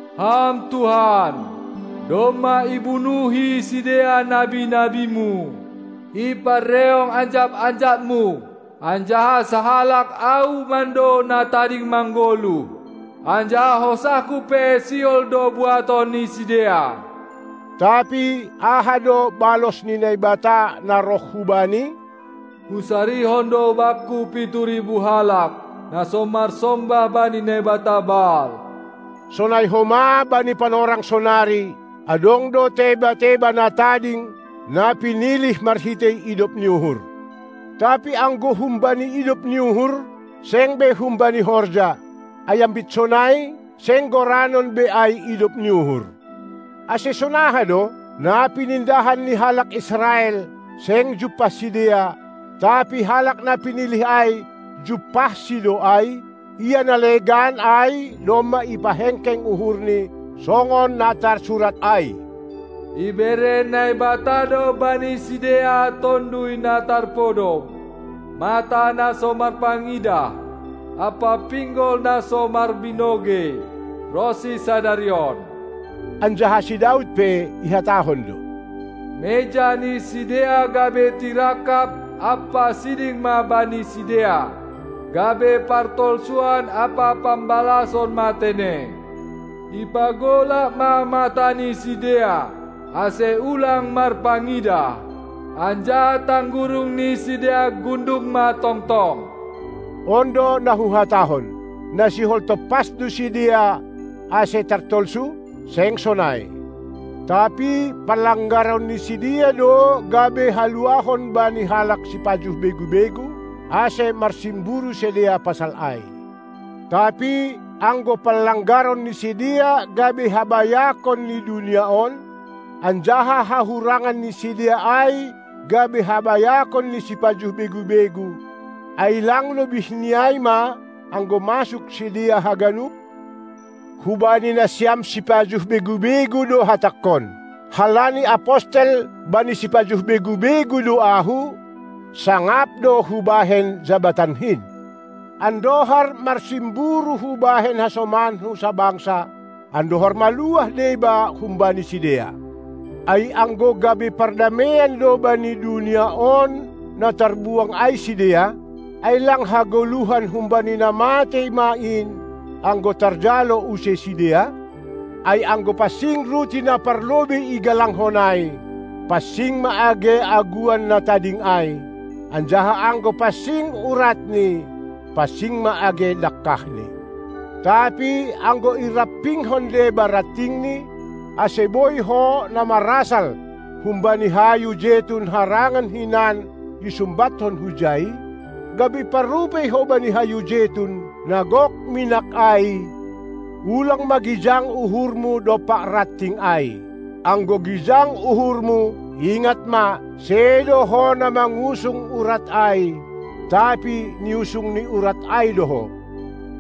Ham Tuhan, domma ibunuhi sidea nabi-nabi-Mu, iparreong anjap-anjap-Mu, anjaha sahalak ahu mando na tading manggoluh, anjaha hosahku pe sihol do buaton ni sidea. Tapi aha do balos ni Naibata na roh hubani? Husarihon do Bangku pitu ribu halak, na so marsombah bani naibata Baal! Sonai homa bani panorang sonari, adong do teba-teba na tading, na pinilih marhitei idop ni uhur. Tapi anggo humbani idop ni uhur, seng be humbani horja, ai ambit sonai, seng goranon be ai idop ni uhur. Ase sonaha do? Na pinindahan ni halak Israel, seng jumpah sidea, tapi halak na pinilih ai jumpahsi do ai; ia na legan ai domma ipahengkeng uhurni, songon na tarsurat ai: Ibere Naibata do bani sidea tonduy na tarpodom, mata na so marpangidah ampa pinggol na so marbinogei ronsi sadari on. Anjaha si Daud pe ihatahon do: Meja ni sidea gabe tirangkap ampa siding ma bani sidea, gabe partolsuan ampa pambalason ma tene! Ipagolap ma mata ni sidea, ase ulang marpangidah, anjaha tanggurung ni sidea gundung ma tongtong! On do na huhatahon: Na sihol tompas do sidea, ase tartolsu? Seng sonai! Tapi panlanggaron ni sidea do gabe haluahon bani halak sipajuh begu-begu, ase marsimburu sidea pasal ai. Tapi, anggo panlanggaron ni sidea gabe habayakon ni dunia on, anjaha hahurangan ni sidea ai gabe habayakon ni sipajuh begu-begu, ai lang lobih ni ai ma, anggo masuk sidea haganup? Hubani nasiam sipajuh begu-begu do hatangkon: Halani apostel bani sipajuh begu-begu do ahu, sangap do hubahen jabatankin, andohar marsimburu hubahen hasomanku sabangsa, andohar maluah deba humbani sidea. Ai anggo gabe pardameian do bani dunia on na tarbuang ai sidea, ai lang hagoluhan humbani na matei ma in, anggo tarjalo use sidea? Ai anggo pansing ruti na parlobei igalangkon ai, pansing ma age aguan na tading ai; anjaha anggo pansing uratni, pansing ma age dangkahni. Tapi anggo irampingkon deba rantingni, ase boi ho, na marasal humbani hayu jetun harangan hinan, isumbathon hujai, gabe parrupei ho bani hayu jetun, na gok minak ai, ulang ma gijang uhurmu dompak ranting ai. Anggo gijang uhurmu, ingat ma, sedo ho na mangusung urat ai, tapi niusung ni urat ai do ho.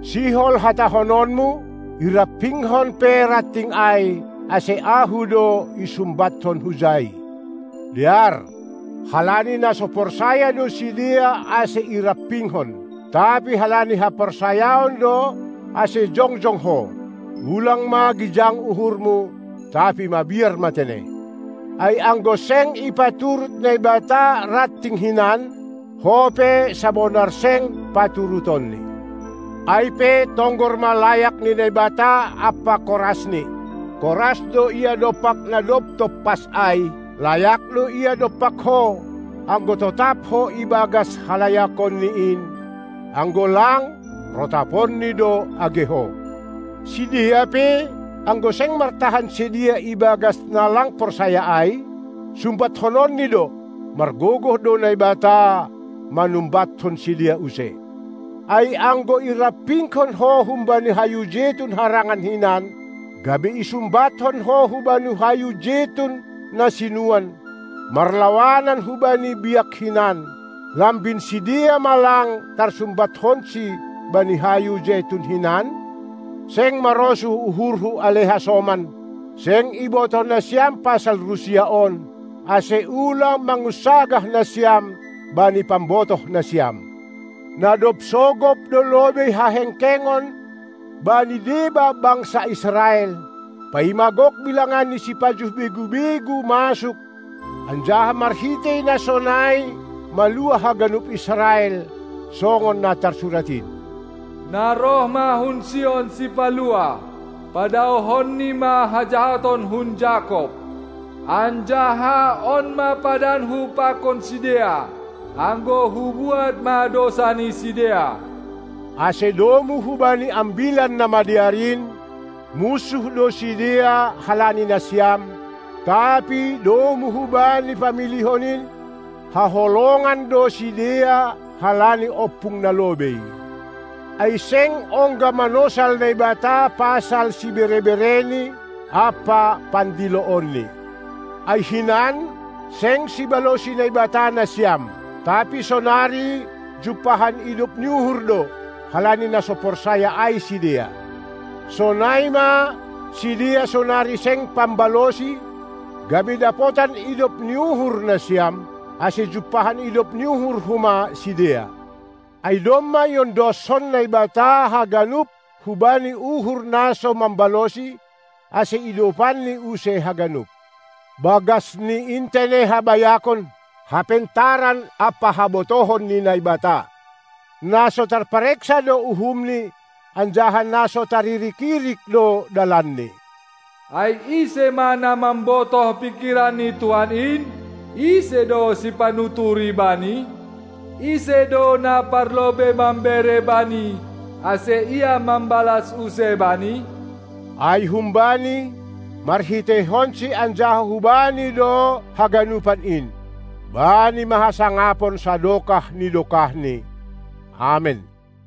Sihol hatahononmu: Irampingkon pe ranting ai, ase ahu do isumbatkon hujai! Dear! Halani na so porsaya do sidea ase irampingkon, tapi halani haporsayaon do ase jongjong ho. Ulang ma gijang uhurmu, tapi mabiar ma tene! Ai anggo seng ipaturut Naibata ranting hinan, ho pe sabonar seng paturutonNi. Ai, pe tonggor ma layak ni Naibata ampa korasNi: Koras do Ia dompak na dob tompas ai; layak do Ia dompak ho, anggo totap ho ibagas halayakonNi in, anggo lang, rotaponNi do age ho! Sidea pe, anggo seng martahan sidea ibagas na lang porsaya ai, sumbathononni do; margogoh do Naibata manumbathon sidea use. Ai anggo irampingkon ho humbani hayu jetun harangan hinan, gabe isumbathon ho hubani hayu jetun na sinuan, marlawanan hubani biak hinan, lambin sidea ma lang tarsumbathonsi bani hayu jetun hinan? Seng marosuh uhurhu, ale hasoman, seng ibotoh nasiam pasal rusia on, ase ulang mangunsagah nasiam bani pambotohnasiam. Na dob sogop do lobei hahengkengon bani deba bangsa Israel, paima gok bilangan ni sipajuh begu-begu masuk, anjaha marhitei na sonai maluah haganup Israel, songon na tarsurat in: Na roh ma hun Sion Sipaluah, padaohonNi ma hajahaton hun Jakob! Anjaha on ma padanku pakon sidea, anggo hubuat ma dousa ni sidea. Ase domu hubani Ambilan Namadear in, munsuh do sidea halani nasiam, tapi domu hubani pamilihon in, haholongan do sidea halani ompung na lobei. Ai seng ongga manosal Naibata pasal sibere-bereNi ampa pandiloonNi. Ai hinan seng sibalosi Naibata nasiam, tapi sonari jumpahan idop ni uhur do, halani na so porsaya ai sidea. Sonai ma sidea sonari seng pambalosi, gabe dapotan idop ni uhur nasiam, ase jumpahan idop ni uhur homa sidea. Ai domma iondoskon Naibata haganup hubani uhur na so mambalosi, ase idopanNi use haganup. Bagasni in tene habayakon, hapentaran ampa habotohon ni Naibata! Na so tarpareksa do uhumNi, anjaha na so taririk-irik do dalanNi! Ai ise ma na mambotoh pingkiran ni Tuhan in? Ise do sipanuturi Bani? Ise do na parlobei mambere Bani, ase Ia mambalas use bani? Ai hum-Bani, marhiteihon-Si anjaha hu-Bani do haganupan in. Bani ma hasangapon sadokah ni dokah ni Amen!